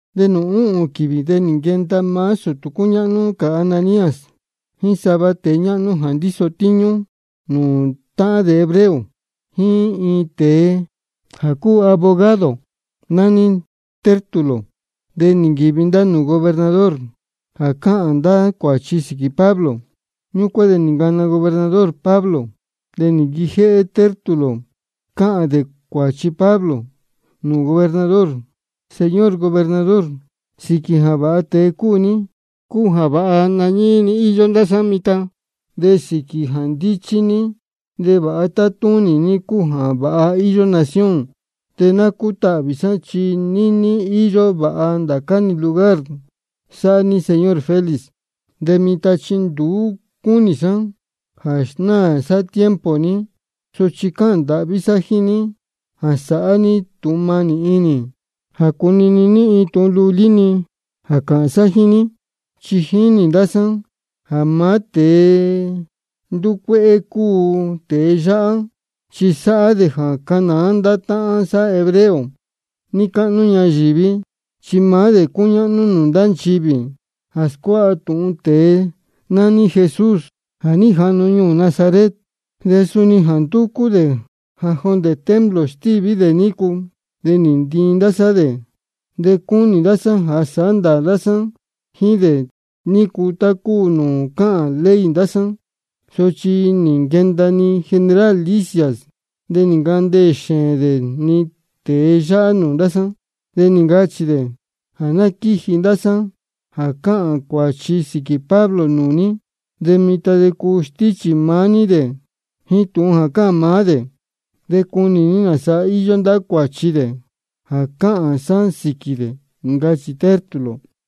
De nūū úhūn quīvī de nī nquenda maá sūtū cúñáhnú cā Ananías jíín sava tēe ñáhnú jā ndíso tíñú nūū táhán dē hebreo jíín iin tēe jā cúu abogado jā nání Tértulo. De nī nquīvi ndá nūū gobernador jā cāhān ndá cuāchi sīquī Pablo. Ñúcuán de nī ncana gobernador Pablo. De nī nquijéhé Tértulo cáhān dē cuāchi Pablo nūū gobernador: Señor gobernador, sīquī jā vāha tēe cúu ní cúu jā vāha nañíí-ni íyó ndá sá mitan, de sīquī jā ndíchí ní de vāha tátúnī ní cúu jā vāha íyó nación. De ná cútahvī sá chi níní íyó vāha ndācá-ni lugar sáhá ní, señor Félix. De mitan chi nduú cúnī sá jā snáā sá tiempo ní, sochi cáhān ndāhví sá jíín ní jā sāhá ní tūhun mānī inī jā cunini ní iin tūhun lulí-ni jā cāhān sá jíín ní. Chi nī jinī ndá sá jā maá tēe ndúcuéhé cúu tēe yáhá, chi sáhá dē jā cánāá ndá táhán sá hebreo níí cáhnú ñayīví. Chi maá dē cúñáhnú nūū ndá nchivī jā scuáha tūhun tēe nání Jesús jā ní jahnu ñuū Nazaret. De suni ja ndúcú dē jā jondē templo stíví dē nícu, de nī ntiin ndá sá dē. De cúnī ndá sá jā sāhá ndāā sá jíín dē nícu tá cúu nūū cáhān ley ndá sá. Sochi nī nquenda-ni general Lisias, de nī ncandeē xēēn dē-ni tēe yáhá nūū ndá sá. De nī ncachī dē jā ná quíji ndá sāán jā cáhān cuāchi sīquī Pablo nūū ní. De mitan de cuu stíchī maá ní dē de jíín tūhun jā cāhān maá dē de cunī ní nāsa íyó ndá cuāchi dē jā cáhān sá sīquī dē, ncachī Tértulo.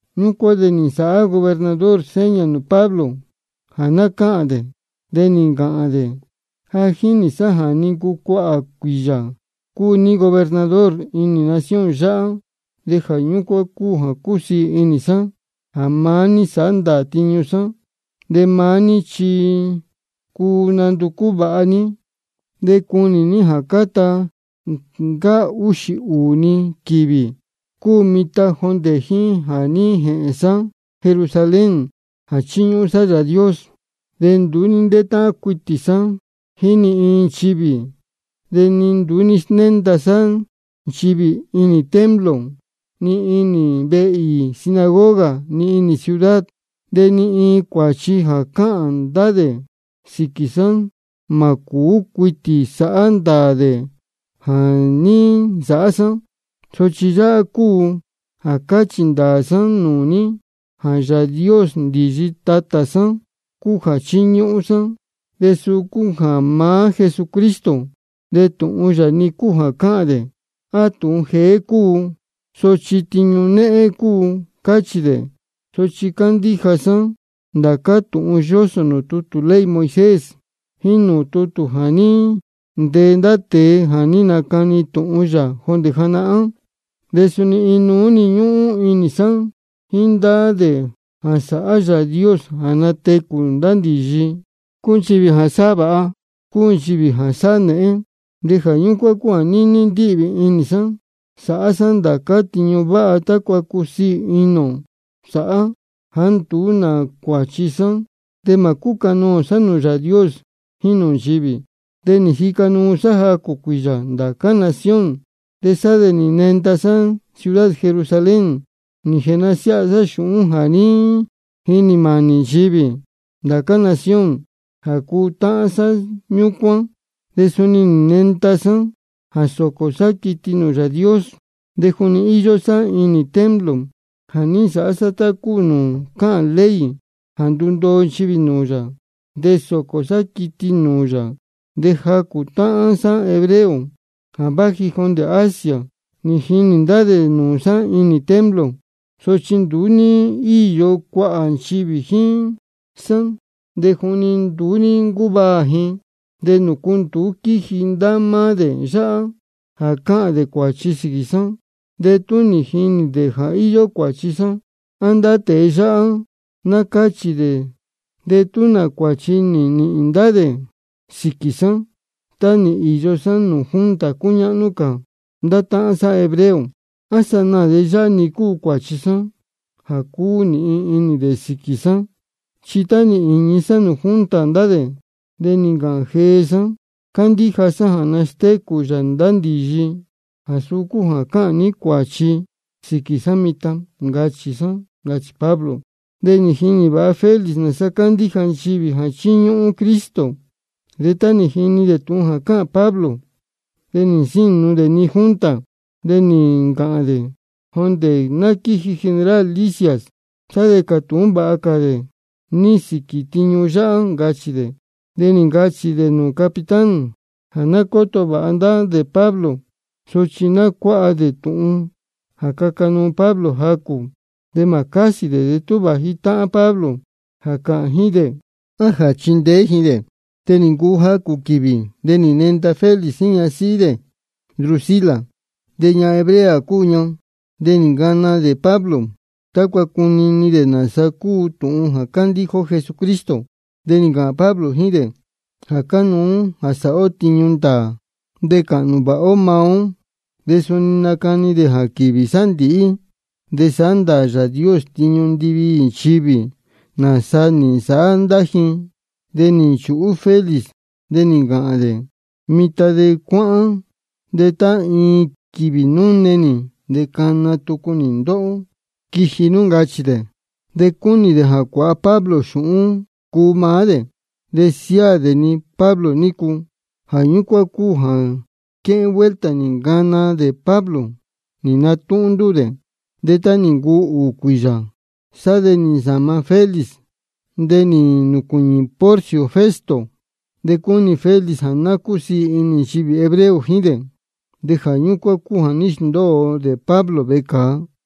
Ñúcuán de nī nsāhá gobernador seña nūū Pablo jā ná cáhān dē, de nī ncāhān dē: Ja jínī sá ja nī ncuu cuāhā cuīyā cúu ní gobernador inī nación yáhá, de jā ñúcuán cúu jā cúsiī inī sá jā maá ní sāhá ndāā tiñu sá. De maá ní chi cuu nanducú vāha ní de cunī ní jā cáta ncáá úxī ūū-ni quīvī cúu mitan jondē jíín jā ní jēhēn sá Jerusalén jā ní jēchiñúhún sá Yāā Dios. De nduú ní ntétáhán cuitī sá jíín ni iin nchivī, de ni nduú ní snénda sá nchivī ni inī templo ni inī ndá vehe īī sinagoga ni inī ciudad. De ni iin cuāchi jā cáhān ndá dē sīquī sá, mā cūú cuitī sāhá ndāā dē jā ní nsāhá sá. Sochi yáhá cúu jā cáchī ndāā sá nūū ní jā Yāā Dios ndīyi tatā sá cúu jā chíñúhún sá, de suu cúu maá Jesucristo. De tūhun yáhá-ni cúu jā cáhān dē jā tūhun jeé cúu, sochi tiñu néhén cúu, cáchī dē. Sochi cándíja sá ndācá tūhun yósō nūū tutū ley Moisés jíín nūū tutū jā ní ntee ndá tēe jā ní nacani tūhun yā jondē janahán. De suni inuú-ni ñúhún inī sá jíín ndá dē jā sāhá Yāā Dios jā natecū ndá ndīyi, cúu nchivī jā sáhá vāha cúu nchivī jā sáhá nēhén. De jā ñúcuán cúu jā níní ndíhvī inī sá sāhá sá ndācá tiñu váha tácua cusiī inī ánō sá jāá nduú nā cuāchi sá de mā cúcanoō sá nūū Yāā Dios jíín nūū nchivī. De nī jica nuu sá jacū cuīyā ndá cā nación, de sá de nī nenda sá ciudad Jerusalén nī jēnasiáha sá xūhún jā ní jinī mānī nchivī ndá cā nación jā cuu táhán sá ñúcuán. De suni nī nenda sá jā sōcō sá quiti nūū Yāā Dios. De juni íyó sá inī templo jā ní nsāhá sá tá cúu nūū cáhān ley jā ndundoo nchivī nūū yā de sócō sá quiti nūū yā, de jacū táhán sá hebreo jā váji jondē Asia nī jinī ndá dē nūū sá inī templo. Sochi nduú ní íyo cuāhā nchivī jíín sá, de juni nduú ní ncúvaā ji. ¿De nūcu nduú ní nquíji ndá máá dē yáhá jā cāhān dē cuāchi sīquī sá de tú nī jinī dē jā íyó cuāchi sá? A ndá tēe yáhá ná cáchī dē de tú nā cuāchi nī nīhīn ndá dē sīquī sá tá nī īyo sá nūū junta cúñáhnú cā ndá táhán sá hebreo. A sanaā de yáhá-ni cúu cuāchi jā cuu nīhīn dē sīquī sá, chi tá nī īñi sá nūū junta ndá dē de nī ncāhān jee sá: Cándíja sá jā nastécū yā ndá ndīyi, de jā suu cúu jā cáhān ní cuāchi sīquī sá mitan, ncachī sá, ncachī Pablo. De ja jínī vāha Félix nāsa cándíja nchivī jā chíñúhún Cristo. De tá nī jini dē tūhun jā cáhān Pablo de nī nsínu dē-ni junta, de nī ncāhān dē: Jondē ná quíji general Lisias sá de cātūhún vāha cā ni sīquī tiñu yáhá, ncachī dē. De nī ncachī dē nūū capitán jā ná cóto vāha dē Pablo, sochi ná cuáha dē tūhun jā caca nuu Pablo jacū, de mā cásī dē de tú vāji táhán Pablo jā cāhān ji jíín dē á jā chindeé ji dē. De nī ncuu jacū quīvī, de nī nenda Félix jíín ñasíhí dē Drusila, de ñahan hebrea cúu ña. De nī ncana dē Pablo tácua cunini dē nāsa cúu tūhun jā candíja ó Jesucristo. De nī ncāhān Pablo jíín dē jā cánuú jā sāhá ó tiñu ndāā de cāhnū vāha ó maá ó. De suni nī nacani dē jā quīvī sándīhí de sāhá ndāā Yāā Dios tiñu ndiviī nchivī nāsa nī nsāhá ndá ji. De nī nchūhú Félix de nī ncāhān dē: Mitan de cuáhán, de tá iin quīvī núne nī de cana tucu nī ndóhó quiji nú, ncachī dē. De cúnī dē jā cuāha Pablo xūhún cuu maá dē de siáā dē-ni Pablo nícu. Jā ñúcuán cúu jā quéhén vuelta nī ncana dē Pablo nī natúhún ndúū dē. De tá nī ncuu ūū cuīyā de sá de nī nsāma Félix de nī nūcuīñī Porcio Festo. De cúnī Félix jā ná cúsiī inī nchivī hebreo jíín dē, de jā ñúcuán cúu jā ní squéndōo dē Pablo vecāa.